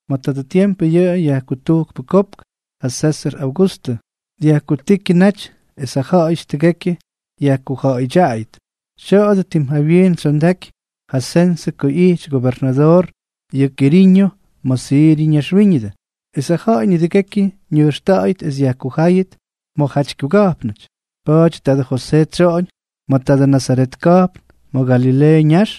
Ma̱ tadʉ tiempʉ yʉ yajkutujkpʉ kopk, ja Sésʉr Augustʉ, dyajkutíkyʉ naty es ja ja̱ꞌa̱yʉty tʉgekyʉ yajkuja̱ꞌa̱yʉdyaꞌayʉt. Tya̱a̱dʉ tim jawyiin tsyondaky ja sensʉ ko ꞌyijty gobernadoor yʉ Kiriño ma̱ Siryʉ ñaxwíñʉdʉ, es ja ja̱ꞌa̱y nidʉgekyʉ ñʉjxta̱ꞌa̱yʉt es yajkujáyʉt ma̱jaty kyuga̱jpnʉty. Pa̱a̱ty tadʉ Josee tsyoꞌoñ ma̱ tadʉ Nazaret ka̱jpn ma̱ Galileeʉ ñax,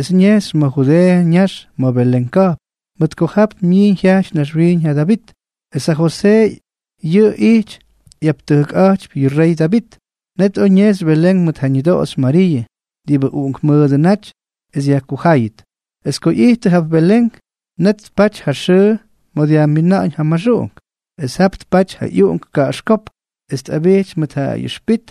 es ñejxy ma̱ Judeeʉ ñax ma̱ Belén ka̱jpn, mʉt ko jap myiiñ jyajty naxwiiñ ja Davit. Es ja Josee yʉꞌʉ ijty ꞌyaptʉjkꞌa̱jtypy yʉ rey Davit. Net oj ñejxy Belén mʉt ja ñʉdoꞌoxy Mariiʉ, diꞌibʉ uꞌunkmʉʉdʉ naty, es yajkujáyʉt. Es ko ꞌyijttʉ jap Belén, net tpaty ja xʉʉ ma̱ dyajmina̱ꞌa̱ñ ja maxuꞌunk. Es jap tpaty ja ꞌyuꞌunk kaꞌaxkópk, es tꞌabijty mʉt ja ꞌyʉxpit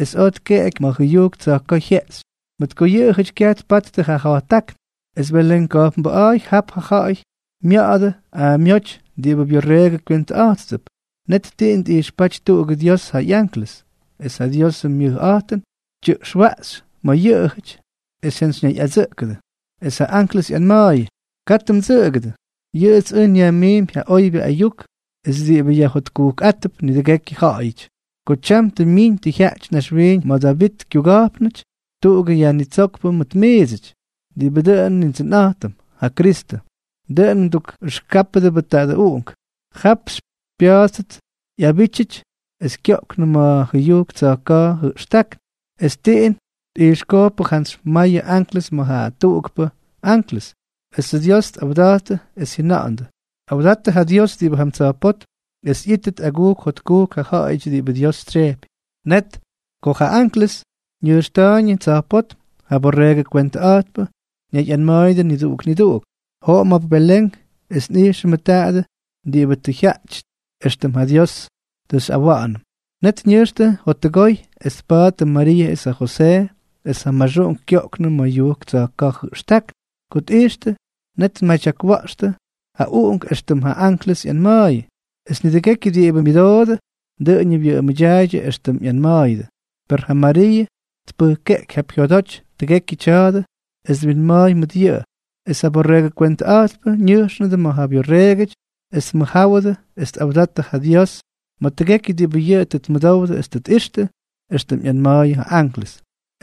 es oj tkeꞌeky ma̱ jʉyujk tsa̱jka̱a̱ jyeꞌxy, mʉt ko yʉꞌʉjʉty kyaj tpattʉ ja ja̱jttákn. Es Belén ka̱jpnbʉꞌa̱a̱y jap ja ja̱ꞌa̱y mya̱ꞌa̱dʉ aamyóty diꞌibʉ byorreegʉ kywentʉꞌa̱jttʉp. Net tiꞌin tꞌijxpáty tuꞌugʉ Dios ja ꞌyanklʉs, es ja Diosʉ myʉjꞌa̱jtʉn tyʉꞌxwaꞌxy ma̱ yʉꞌʉjʉty, es jyantsyñayꞌadsʉꞌkʉdʉ. Es ja anklʉs ꞌyanma̱a̱yʉ: —Katʉ mdsʉꞌʉgʉdʉ. Yʉꞌʉts ʉj nyajmiimpy ja oybyʉ ayuk es diꞌibʉ yajjotkujkꞌáttʉp nidʉgekyʉ ja̱ꞌa̱yʉty. Ko tyam tʉ myiñ jyaꞌty naxwiiñ ma̱ Davitʉ kyuga̱jpnʉty tuꞌugʉ Yajnitsókpʉ mʉt miidsʉty, diꞌibʉ dʉꞌʉn Nindsʉnꞌa̱jtʉm, ja Kristʉ. Dʉꞌʉn mdukꞌʉxkáptʉbʉ tadʉ uꞌunk: Jap xypya̱a̱ttʉt ꞌyabítyʉty es kyoꞌknʉ ma̱ jʉyujk tsa̱jka̱ jʉꞌxtákn. Es tiꞌin tꞌijxkojkpʉ jantsy mayʉ anklʉs ma̱ ja tuꞌukpʉ anklʉs, esʉ Dios tꞌawdattʉ es jyʉna̱ꞌa̱ndʉ: Awdattʉ ja Dios diꞌibʉ jam tsa̱jpótm, es ꞌyíttʉt agujk jotkujk ja ja̱ꞌa̱yʉty diꞌibʉ Dios tsyejpy. Net ko ja anklʉs ñʉjxta̱a̱yñʉ tsa̱jpótm, ja borreegʉ kwentʉꞌa̱jtpʉ ñayꞌanma̱a̱yʉdʉ niduꞌuk niduꞌuk: —Joꞌom jap Belén es nꞌijxʉmʉ tadʉ diꞌibʉ tʉ jyátyʉty, éxtʉm ja Dios tʉ xyꞌawa̱ꞌa̱nʉm. Net ñʉjxtʉ jottʉgoy es tpattʉ Mariiʉ es ja Josee, es ja maxuꞌunk kyoꞌknʉ ma̱ jʉyujk tsa̱jka̱ jʉꞌxtákn. Ko tꞌijxtʉ, net tmadyakwa̱ꞌxtʉ ja uꞌunk éxtʉm ja anklʉs ꞌyanma̱a̱yʉ. Es nidʉgékyʉty diꞌibʉ myʉdoodʉ, dʉꞌʉñʉ wyʉꞌʉmʉdyaaydyʉ éxtʉm ꞌyanma̱a̱yʉdʉ. Per ja Mariiʉ tpʉjkeꞌky jap jyodoty tʉgekyʉ tya̱a̱dʉ es twinma̱a̱y mʉt yʉꞌʉ. Es ja borreegʉ kwentʉꞌa̱jtpʉ ñʉjxnʉdʉ ma̱ ja byorreegʉty es tmʉjjáwʉdʉ es tꞌawdattʉ ja Dios ma̱ tʉgekyʉ diꞌibʉ yʉꞌʉ tʉ tmʉdowdʉ es tʉ tꞌixtʉ, éxtʉm ꞌyanma̱a̱yʉ ja anklʉs.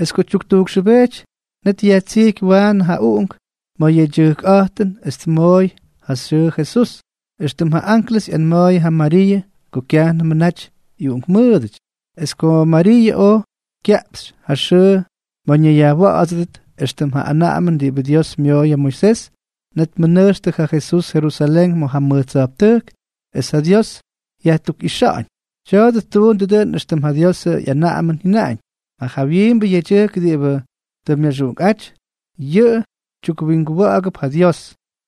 Es ko tyuktujkxʉbejty, net yajtsijky waanʉ ja uꞌunk ma̱ ja yedyʉjkꞌa̱jtʉn es tmooy ja xyʉʉ Jesús, éxtʉm ja anklʉs ꞌyanma̱a̱yʉ ja Mariiʉ ko kyajnʉmʉ naty ꞌyuꞌunkmʉʉdʉty. Es ko Mariiʉ oj kyaꞌpxy ja xʉʉ ma̱ ñayyajwa̱ꞌa̱dsʉdʉt éxtʉm ja anaꞌamʉn diꞌibʉ Dios myooy ja Moisés, net tmʉnʉjxtʉ ja Jesús Jerusalén ma̱ ja mʉj tsa̱jptʉjk es ja Dios yajtukꞌixa̱ꞌa̱ñ. Tya̱a̱dʉ ttuundʉ dʉꞌʉn éxtʉm ja Diosʉ ꞌyanaꞌamʉn jyʉnaꞌañ: “Ja jawyiimbʉ yedyʉjk diꞌibʉ tʉ myaxuꞌunkꞌáty, yʉꞌʉ tyukwinguwa̱ꞌa̱gʉp ja Dios.”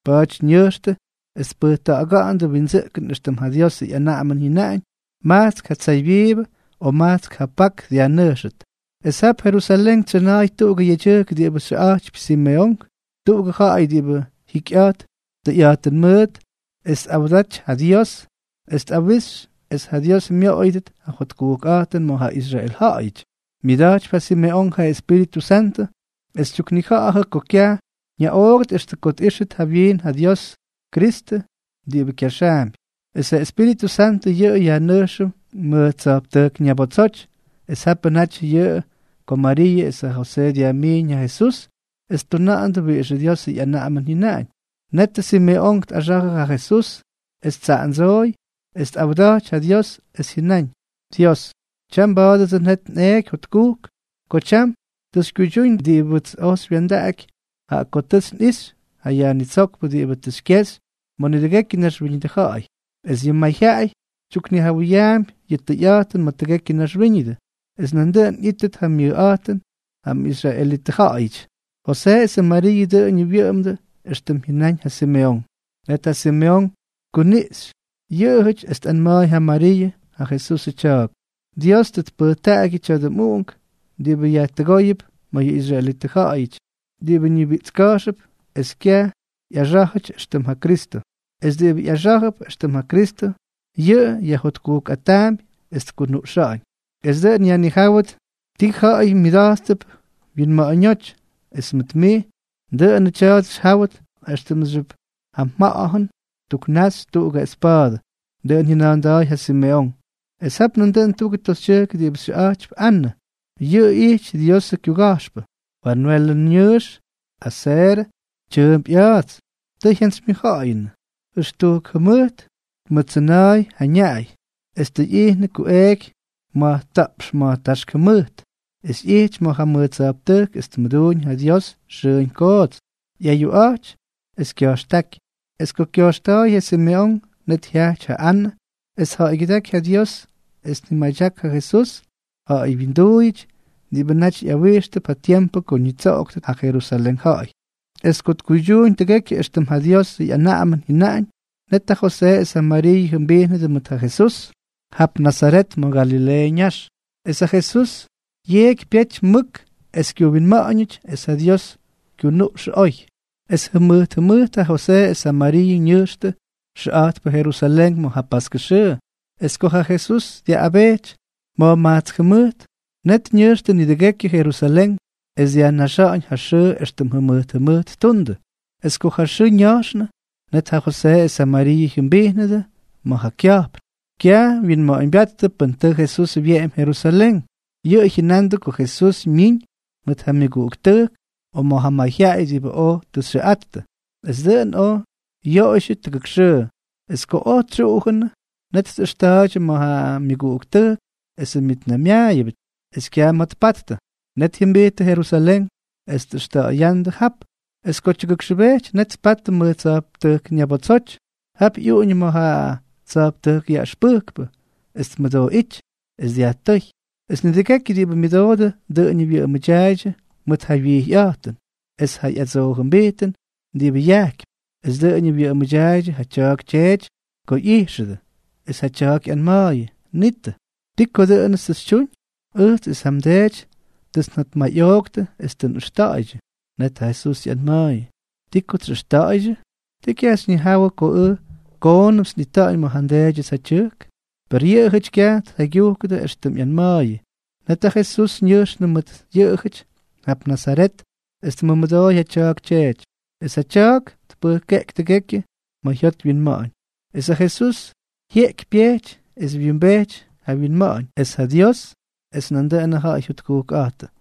Pa̱a̱ty ñʉjxtʉ es tpʉjkta̱ꞌa̱ga̱ꞌa̱ndʉ windsʉꞌkʉn éxtʉm ja Diosʉ ꞌyanaꞌamʉn jyʉnaꞌañ: majtsk ja tsaybyiibʉ o majtsk ja pak dyajnʉjxʉt. Es jap Jerusalén tsyʉna̱a̱y tuꞌugʉ yedyʉjk diꞌibʉ xyʉꞌa̱jtypy Simeonk, tuꞌugʉ ja̱ꞌa̱y diꞌibʉ jikyꞌa̱jt tʉyꞌa̱jtʉn mʉʉt es tꞌawdaty ja Dios es tꞌawixy es ja Dios myoꞌoyʉdʉt ja jotkujkꞌa̱jtʉn ma̱ ja Israel ja̱ꞌa̱yʉty. Myʉda̱jtypy ja Simeonk ja Espíritʉ Santʉ, es tyuknija̱ꞌa̱jʉ ko kyaj ñaꞌoogʉt extʉ ko tꞌíxʉt jawyiin ja Diosʉ Kyristʉ diꞌibʉ kyaxaampy. Es ja Espíritʉ Santʉ yʉꞌʉ yajnʉjxʉ mʉj tsa̱jptʉjk ñabotsoty. Es japʉ naty yʉꞌʉ ko Mariiʉ es ja Josee dyajmiiñ ja Jesús es ttuna̱ꞌa̱ndʉ wiꞌixʉ Diosʉ ꞌyanaꞌamʉn jyʉnaꞌañ. Net ja Simeonk tꞌaxa̱jʉ ja Jesús es ttsaꞌandsooy, es tꞌawda̱jty ja Dios, es jyʉnáñ: Dios, tyam mba̱a̱dʉdsʉ net nꞌeeky jotkujk ko tyam tʉ xykyuydyúñ diꞌibʉts oj xywya̱ndaꞌaky, jaꞌa ko tʉts nꞌixy ja Yajnitsókpʉ diꞌibʉ tʉ xykyexy ma̱ nidʉgekyʉ naxwíñʉdʉ ja̱ꞌa̱y, es yʉꞌʉ mayjyaꞌay tyuknijawʉyaampy yʉ tʉyꞌa̱jtʉn ma̱ tʉgekyʉ naxwíñʉdʉ, es nandʉꞌʉn ꞌyítʉt ja myʉjꞌa̱jtʉn ja mꞌisraelitʉ ja̱ꞌa̱yʉty. Josee es ja Mariiʉ dʉꞌʉñʉ wyʉꞌʉmdʉ éxtʉm jyʉnáñ ja Simeonk. Net ja Simeonk tkuniꞌxy yʉꞌʉjʉty, es tꞌanma̱a̱y ja Mariiʉ, ja Jesusʉ tya̱a̱k: —Dios tʉ tpʉjtaꞌagyʉ tya̱dʉ mꞌuꞌunk diꞌibʉ yajtʉgóyʉp mayʉ israelitʉ ja̱ꞌa̱yʉty diꞌibʉ ñibiꞌtska̱jxʉp es kyaj ꞌyaxá̱jʉty éxtʉm ja Kristʉ. Es diꞌibʉ ꞌyaxá̱jʉp éxtʉm ja Kristʉ, yʉꞌʉ yajjotkujkꞌataampy es tkunuꞌxa̱ꞌa̱ñ. Es dʉꞌʉn yajnijáwʉt ti ja̱ꞌa̱y myʉda̱jttʉp wyinma̱ꞌa̱ñóty. Es mʉt mij, dʉꞌʉnʉ tya̱a̱dʉ xyjáwʉt éxtʉmxyʉp ja mja̱ꞌa̱jʉn ttuknaxy tuꞌugʉ espa̱a̱dʉ. Dʉꞌʉn jyʉna̱a̱nda̱a̱y ja Simeonk. Es jap nandʉꞌʉn tuꞌugʉ toxytyʉjk diꞌibʉ xyʉꞌa̱jtypy Anʉ. Yʉꞌʉ ijty Diosʉ kyuga̱jxpʉ, Fanwelʉ ñʉʉx es ja Aserʉ tyʉʉmp ꞌya̱a̱ts. Tʉ jyantsymyʉjja̱ꞌa̱yʉnʉ. Jʉxtujk jʉmʉjt tmʉttsʉna̱a̱y ja ñaꞌay, es tʉ ꞌyijnʉ kuꞌeeky ma̱jta̱ꞌpx ma̱jtáxk jʉmʉjt. Es ꞌyijty ma̱ ja mʉj tsa̱jptʉjk es tmʉduuñ ja Dios xʉʉñ koots, ꞌyayuꞌa̱jty es kya̱jxtáky. Es ko kya̱jxta̱a̱y ja Simeonk, net jyajty ja Anʉ es tja̱ꞌa̱ygyʉdáky ja Dios es ñimadyak ja Jesús ja̱ꞌa̱y wyinduuyʉty diꞌibʉ naty ꞌyawijxtʉp ja tiempʉ ko ñitsoꞌoktʉt ja Jerusalén ja̱ꞌa̱y. Es ko tkuydyuuñ tʉgekyʉ éxtʉm ja Diosʉ ꞌyanaꞌamʉn jyʉnaꞌañ, net ja Josee es ja Mariiʉ jyʉmbijnʉdʉ mʉt ja Jesús jap Nazaret ma̱ Galileeʉ ñax. Es ja Jesús yeꞌky pyejty mʉk es kyuwinma̱ꞌa̱ñʉty, es ja Dios kyunuꞌxʉ oy. Es jʉmʉjt jʉmʉjt ja Josee es ja Mariiʉ ñʉjxtʉ xʉꞌa̱jtpʉ Jerusalén ma̱ ja paskʉ xʉʉ. Es ko ja Jesús dyaꞌꞌabejty ma̱jmajtsk jʉmʉjt, net ñʉjxtʉ nidʉgekyʉ Jerusalén es dyajnaxa̱ꞌa̱ñ ja xʉʉ éxtʉm jʉmʉjt jʉmʉjt ttuundʉ. Es ko ja xʉʉ ña̱jxnʉ, net ja Josee es ja Mariiʉ jyʉmbijnʉdʉ ma̱ kya̱jpn. Kyaj wyinma̱ꞌa̱ñbyáttʉ pʉn tʉ Jesús wyeꞌemy Jerusalén. Yʉꞌʉ jyʉnandʉ ko Jesús myiñ mʉt ja myʉguꞌuktʉjk o ma̱ ja mayjyaꞌay diꞌibʉ oj tʉ xyʉꞌattʉ. Es dʉꞌʉn oj yoꞌoydyʉ tuk xʉʉ. Es ko oj tsyuꞌujʉnʉ, net tꞌʉxta̱a̱ydyʉ ma̱ myʉguꞌuktʉjk esʉ myʉtnaymyaayʉbʉty, es kyaj ma̱ tpattʉ. Net jyʉmbijttʉ Jerusalén es tꞌʉxta̱ꞌa̱ya̱ꞌa̱ndʉ jap. Es ko tyʉgʉkxʉbejty, net tpattʉ mʉj tsa̱jptʉjk ñabotsoty. Jap ꞌyuꞌuñʉ ma̱ ja tsa̱jptʉjk yaꞌʉxpʉjkpʉ es tmʉdooꞌíty es dyajtʉ́y. Es nidʉgekyʉ diꞌibʉ myʉdoodʉ dʉꞌʉñʉ wyʉꞌʉmʉdyaaydyʉ mʉt ja wyijyꞌa̱jtʉn es ja ꞌyadsoojʉmbijtʉn diꞌibʉ yajkypy. Es dʉꞌʉñʉ wyʉꞌʉmʉdyaaydyʉ ja tya̱a̱k tyeety ko ꞌyijxʉdʉ. Es ja tya̱a̱k ꞌyanma̱a̱yʉ: —Nitʉ, ¿ti ko dʉꞌʉnʉts tʉ xytyuñ? Ʉjts es ja mdeety tʉts njotmayꞌooktʉ es tʉ nꞌʉxta̱ꞌa̱ydyʉ. Net ja Jesús ꞌyanma̱a̱yʉ: —¿Ti kots xyꞌʉxta̱ꞌa̱ydyʉ? ¿Ti kyaj xyñijawʉ ko ʉj koonʉmts nꞌita̱ꞌa̱ñ ma̱ ja nDeedyʉts ja tyʉjk? Per yʉꞌʉjʉty kyaj tjaygyujkʉdʉ éxtʉm ꞌyanma̱a̱yʉ. Net ja Jesús ñʉjxnʉ mʉt yʉꞌʉjʉty jap Nazaret es tmʉmʉdooy ja tya̱a̱k tyeety. Es ja tya̱a̱k tpʉjkeꞌky tʉgekyʉ ma̱ jyot wyinma̱ꞌa̱ñ. Es ja Jesús yeꞌky pyejty es wyimbejty ja wyinma̱ꞌa̱ñ, es ja Dios es nandʉꞌʉnʉ ja̱ꞌa̱y jyotkujkꞌa̱jtʉ.